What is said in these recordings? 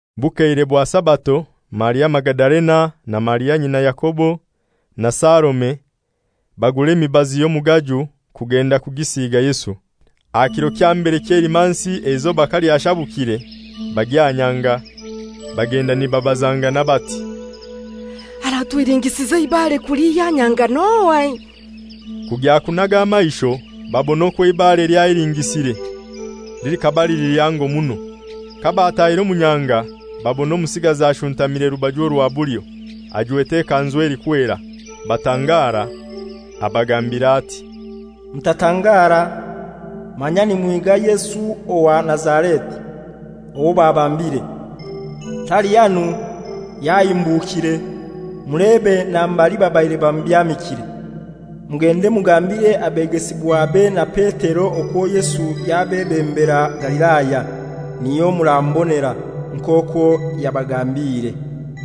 Bukeire bwa Sabato, Maria Magadalena, na Maria nyina Yakobo, na Salome, bagura emibazi y'omugaju kugenda kugisiiga Yesu. Aha kiro kya mbere ky'Eilimansi eizoba kalyashabukire bagya aha nyanga. Bagenda nibabazangana bati, «Aratuhilingisiza eibare kulihya aha nyanga n'ohai?» Kugya kunaga amaisho babona okwo eibare lyahilingisire, likaba lili lihango muno. Kabatahire omu nyanga babona omusigazi ashuntamire rubaju orwa bulyo, ajwete ekanzu elikwera. Batangara. Abagambira ati, «Mutatangara. Manya nimuhiga Yesu owa Nazareti, owo babambire. Tali hanu, yahimbukire, mulebe na mbali babaire bamubyamikire. Mugende mugambire abegesibwabe na Petero okwo Yesu yabebembera Galilaya, niyo muramubonera, nk'okwo yabagambiire.»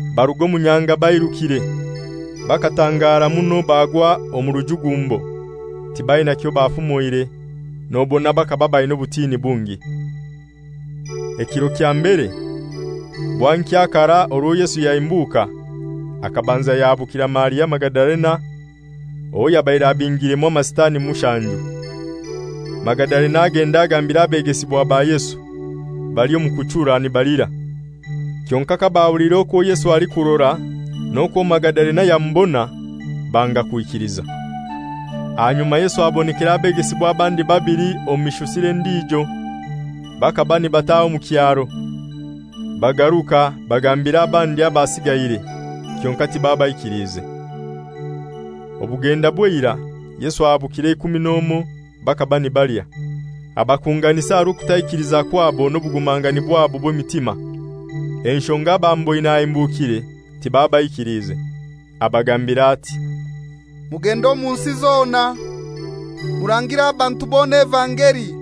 Baruga omu nyanga bairukire. Bakatangara muno bagwa omu rujugumbo. Tibaina kyo bafumoire, nobona bakaba baina obutini bungi. Ekiro kya mbere bwankya karai orwo Yesu yahimbuka, akabanza yahabukira Maria Magadalena, owo yabaire abingiremu Amasitani mushanju. Magadalena agenda agambira abegesibwa ba Yesu, bali omu kuchura nibalira. Kyonkai kabahuliire okwo Yesu alikurora n'okwo Magadalena yamubona, banga kwikiliza. Ahanyuma Yesu abonekera abegesibwa abandi babili omu mishusire endijo, bakaba nibataha omu kyaro. Bagaruka bagambira abandi abasiigaire, kyonkai tibabaikiliize. Obugenda bw'eirai Yesu ahabukira eikumi n'omoi, bakaba nibalya. Abakunganisa aha rw'okutaikiliza kwabo n'obugumangani bwabo bw'emitima, enshonga abamuboine ahimbukire tibabaikiliize. Abagambira ati, «Mugende omu nsi zona, murangire abantu bona evangeli.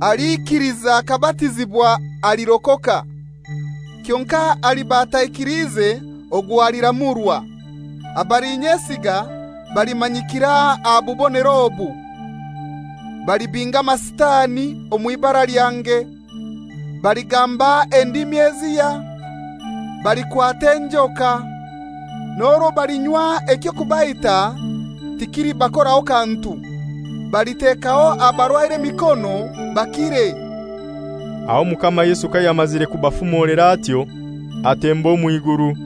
Aliikiliza akabatizibwa alirokoka. Kyonkai aliba ataikiliize ogwo aliramurwa. Abalinyesiga balimanyikira aha bubonero obu: Balibinga Amasitani omw'ibara lyange, baligamba endimi ezihya, balikwata enjoka. N'orwo balinywa eky'okubaita tikilibakoraho kantu. Balitekaho abarwaire emikono bakire.» Aho Omukama Yesu kayamazire kubafumolera atyo, atemba omw'iguru,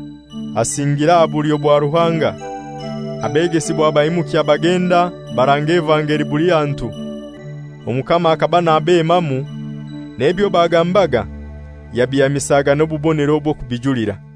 asingira aha bulyo bwa Ruhanga. Abegesibwa baimukya bagenda, baranga evangeli buli hantu. Omukama akaba nabemamu, n'ebyo bagambaga yabihamisaga n'obubonero obwo kubijulira.]